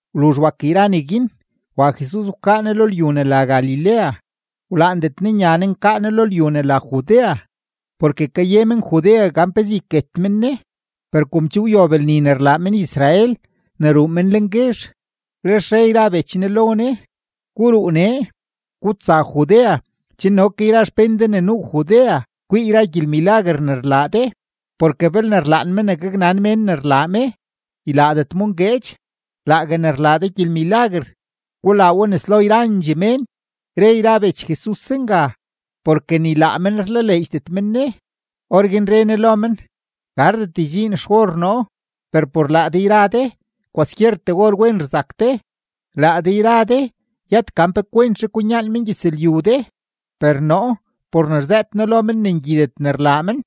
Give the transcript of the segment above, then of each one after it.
Wluzh wak yra neguin, wa Jesus wkaa Ne lo lyu ne la Galilea; wlaandet Ne nya Ne nkaa Ne lo lyu ne la Judea porke kaye men-Judea gan pezee yket men Ne. Per kom che wyob lni ne rlaa men-Israel ne ruu men lenguezh, lex re yra bech Ne lo Ne: ―Guruu nee, gutsa Judea chen no ke yra xpén de ne nuu Judea kwii yra gyelmilaguer ne rlaa de. Porke belne rlaan me ne gaknan mén ne rlaa me, ylaadet mo ngueedx. Laague ne rlaa de gyelmilaguer, gulaa we nes lo yrandxee mén. Re yra bech Jesus zenga, porke ni laa men rlaleedxdet men Ne. Orguin re Ne lo men: ―Gardet ydxiin xor noo, per por laa de yra de kwaskyertee or wen rzak de. Laa de yra de yët gan pe kwentzhe kwinyaan mengyëzlyu de, per noo por ne rzëët noo lo men ne ngyidet ne rlaa men,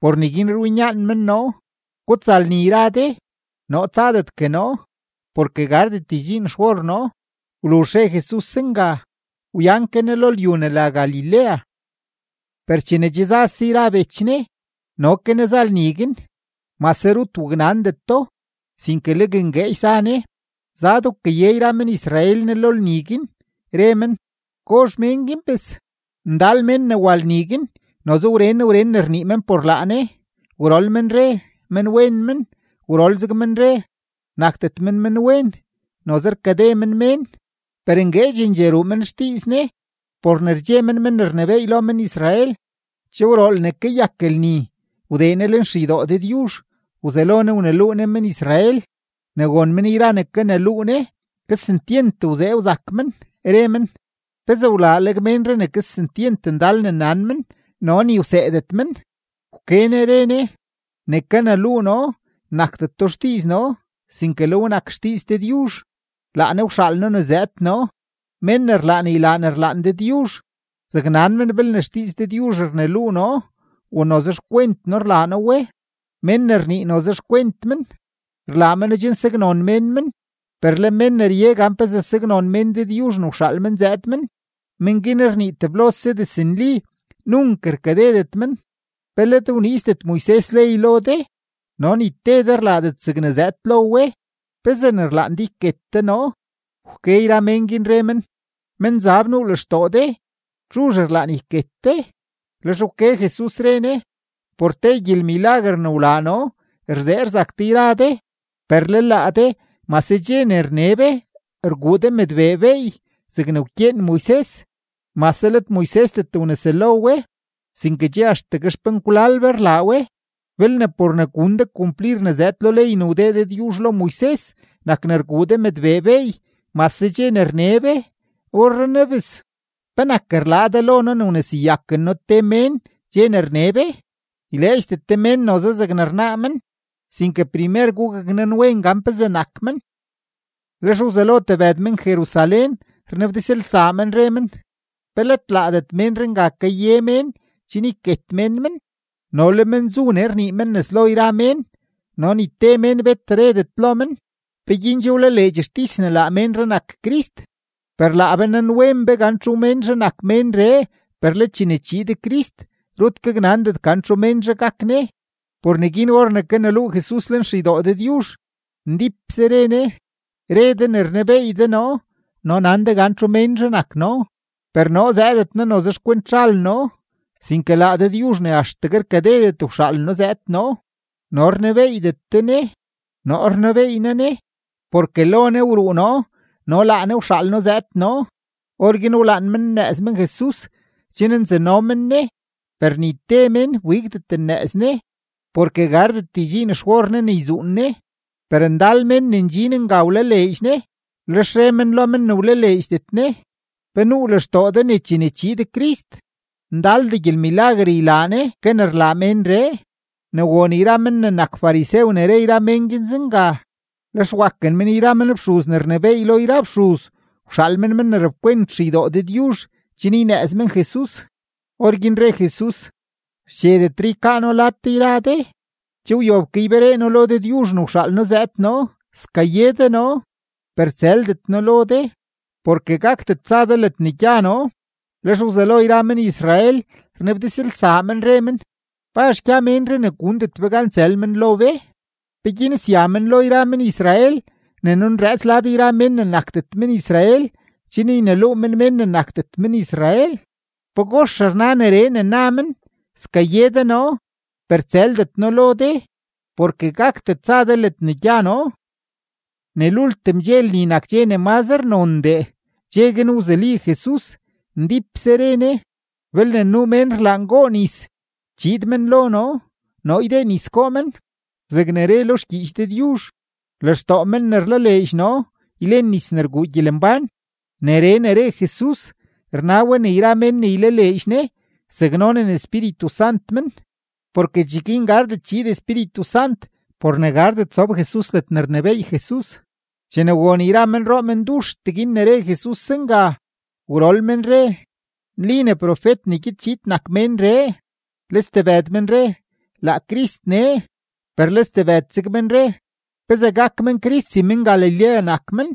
por neguin rwinyaan men noo. Gutsa lni yra de; noo tsadetgue noo, porke gardet ydxiin xor noo. Wluzh re Jesus zenga, wyan ke Ne lo lyu ne la Galilea. Per chene che zase yra bech Jesus, no ke Ne za lni guin, mase rut waknandeto, sinke legue ngueedx za Ne. Zad wkaye yra men-Israel Ne lo lni guin, re men: ―¿Gozh mén guin, bes? Ndal mén ne wa lni guin noze wren wren ne rnii men por laa Ne. Gwrol men re: “Menwen men.” Gwrol zeg men re: “Nakdet men menwen, noze rkade men mén.” Per ngueedxendxee ruu men xdiiz Ne por ne rdxe men men ne rnebééy lo men-Israel. Che wrool ne kayak lni, wdee Ne lenxeydoo Dëdyuzh, wzelo Ne wneluu Ne men-Israel. Ne won men yra ne kaneluu Ne men, kesentyent wzee wzak men, re men: ―¿Pezee wlaaleg ménree ne kesentyent ndal ne nan men, no ni wseedet men? Wke Ne re Ne: ―Ne kaneluu noo nakdeto xdiiz noo, sinke le we nak xdiiz Dëdyuzh, laa Ne wxaal noo zëëd noo. Mén ne rlaan ylaa ne rlaan Dëdyuzh, zaknan men belne xdiiz Dëdyuzh rneluu noo o noze xkwent noo rlaa noo we. Mén ne rnii noze xkwent men, rlaa meno chen saknon mén men; per le men ne rye gan pezee saknon mén Dëdyuzh ne wxaal men zëëd men, men guin rnii teblose diznli, nunk rkadedet men. ’¿Pe let wniizdet Moises ley lo de, no ni te de rlaadet zegne zëëd lo we? ¿Pezee ne rlaan de yket de noo? Wke yra mén, re men: ―Menzab nuu lextoo de. ¿Txuzh rlaan yket de? Lex wke Jesus, re Ne: ―Por te gyelmilaguer ne wlaa noo rzee rzak de yra de. Per le laa de mase dxe ne rne be, rguu de mëdbee beey zegne wkyeen Moises (mase let Moisesdet wneselo we, sinke che axtegue xpenkwlal be rlaa we). Belne por ne gun de kumplir ne zëëd lo ley ne wdee Dëdyuzh lo Moises nak ne rguu de mëdbee beey mase dxe ne rne be, orrenaa bes, ¿penak rlaa de lo noo ne wneseyaken noo te mén dxe ne rne be? Yleedxdet de mén noze zegne rnaa men, sinke primer gugaknanwen gan pezee nak men. Lex wzelo tebëd men-Jerusalén rnabdizlsaa men, re men: ―¿Pe let laadet ménree nga kaye mén chen yket mén men? No le men zu nee rnii men nes lo yra mén, no ni te mén bet redet lo men. ¿Peguin che wlaleedx xtis ne laa ménree nak Crist? Per laa be nanwen be gan txu ménzhe nak ménree. Per le chene chiid Crist, rut gaknandet gan txu ménzhe gak Ne. Por neguin or ne kaneluu Jesus lenxeydoo Dëdyuzh, ndípse re Ne: ―¡Re de ne rnebeey de noo no nan de gan txu ménzhe nak noo! Per noo zëëdet noo noze xkwent zhal noo, sinke laa Dëdyuzh ne axtegue rkadedet wxaal noo zëëd noo, no rnebeeydet de Ne. Noo rnebeey noo Ne, porke lo Ne wruu noo no laa Ne wxaal noo zëëd noo. Orguin wlaan men nnëëz men Jesus chen nzano men Ne, per ni te mén wbigdet nnëëz Ne porke gardet ydxiin xor Ne ne yzuun Ne. Per ndal mén ne ndxin nga wlaleedx Ne, lex re men lo men ne wlaleedxdet Ne: ―¿Pe nuu lextoo de ne chene chiid Crist, ndaldee gyelmilaguer ylaa Ne ke ne rlaa ménree? Ne won yra men ne nak farisew ne re yra mén guin zenga, lex waken men yra men fxuz ne rnebééy lo yra fxuz wxaal men men ne rapkwent xeydoo Dëdyuzh chen ynëëz men Jesus. Orguin re Jesus: ―Xchedetre ykaa noo lad de yra de, che wyob ke yberee noo lo Dëdyuzh ne wxaal noo zëëd noo. Skaye de noo, per tsëldet noo lo de, porke gakdet tsa de ledne gya noo. Lex wzelo yra men-Israel rnabdizlsaa men, re men: ―¿Pazh gya ménree ne gundet be gan tsël men lo be? ¿Peguin sya men lo yra men-Israel ne nunrëëts lad yra mén ne nakdet men-Israel chen yneluu men mén ne nakdet men-Israel? ¿Pagox rna neree ne na men: “Skaye de noo, per tsëldet noo lo de, porke gakdet tsa de ledne gya noo”? Ne lultim dxe lni nak dxe ne mazre nondee. Dxe guin wzuli Jesus, ndípse re Ne: ―Belne nuu mén rlaan goo nis, chiid men lo noo, noo ydee nis goo men. Zegne re lo xgyiich Dëdyuzh, lextoo men ne rlaleedx noo ylen nis ne rguu gyelembán. Neree ne re Jesus, rna we ne yra mén ne ylaleedx Ne zaknonen Espíritu Sant men; porke cheguin gardet chiid Espíritu Sant por ne gardet sob Jesus ledne rnebééy Jesus. Chene won yra menroo menduxtee guin ne re Jesus zenga, gwrol men re: ―Nli ne profet ne gyed chiid nak ménree. Le stebëd men re: ―Laa Crist nee. Per le stebëd zeg men re: ―¿Pezee gak men Crist si men-Galilea nak men?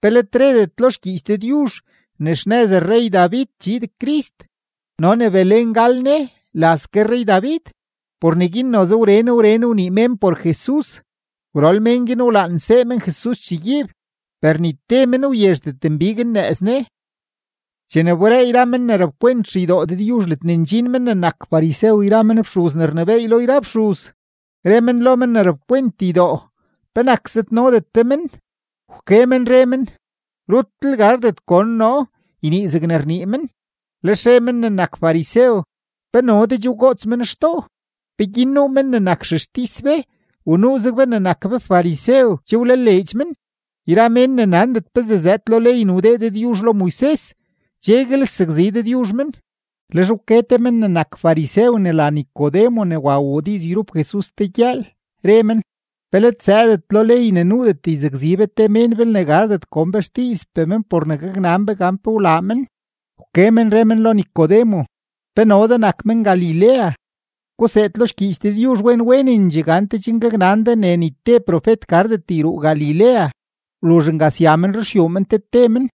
¿Pe let redet lo xgyiich Dëdyuzh ne xnëz rrey-David chiid Crist no ne Belén gal Ne, laz ke rrey-David? Por neguin noze wren wren ne wnii mén por Jesus. Gwrol men guin wlaan nsee men Jesus chegyiib, per ni te men wyezhdet nbig nnëëz Ne. Chene wberee yra men ne rapkwent xeydoo Dëdyuzh ledne ndxin men ne nak farisew yra men fxuz ne rnebééy lo yra fxuz, re men lo men ne rapkwent ydoo: ―¿Penak zëdnodet de men? Wke men re men: ―¡Rutlel gardet gon noo ynii zegne rnii men! Lex re men ne nak farisew: ―¿Pe no de che wgoots men xtoo? ¿Peguin nuu men ne nak xextis be u nuuzeg be ne nak be farisew che wlaleedx men? Yra mén ne nandet pezee zëëd lo ley ne wdee Dëdyuzh lo Moises, cheguel sakzi Dëdyuzh men. Lex wke te ke men ne nak farisew ne la Nicodemo ne wa wuu diiz yrup Jesus te gyëël, re men: ―¿Pe let zëëdet lo ley ne nuudet yzakzi be te mén belne gardet gon be xdiizpee men por ne gaknan be gan pe wlaa men? Wke men re men lo Nicodemo: ―¿Pe no de nak men-Galilea? Guseed lo xgyiich Dëdyuzh wen wenendxee gante chen gaknan de ne ni te profet gardet yruu Galilea. Wluzh nga sya men ruxyuu men te te men.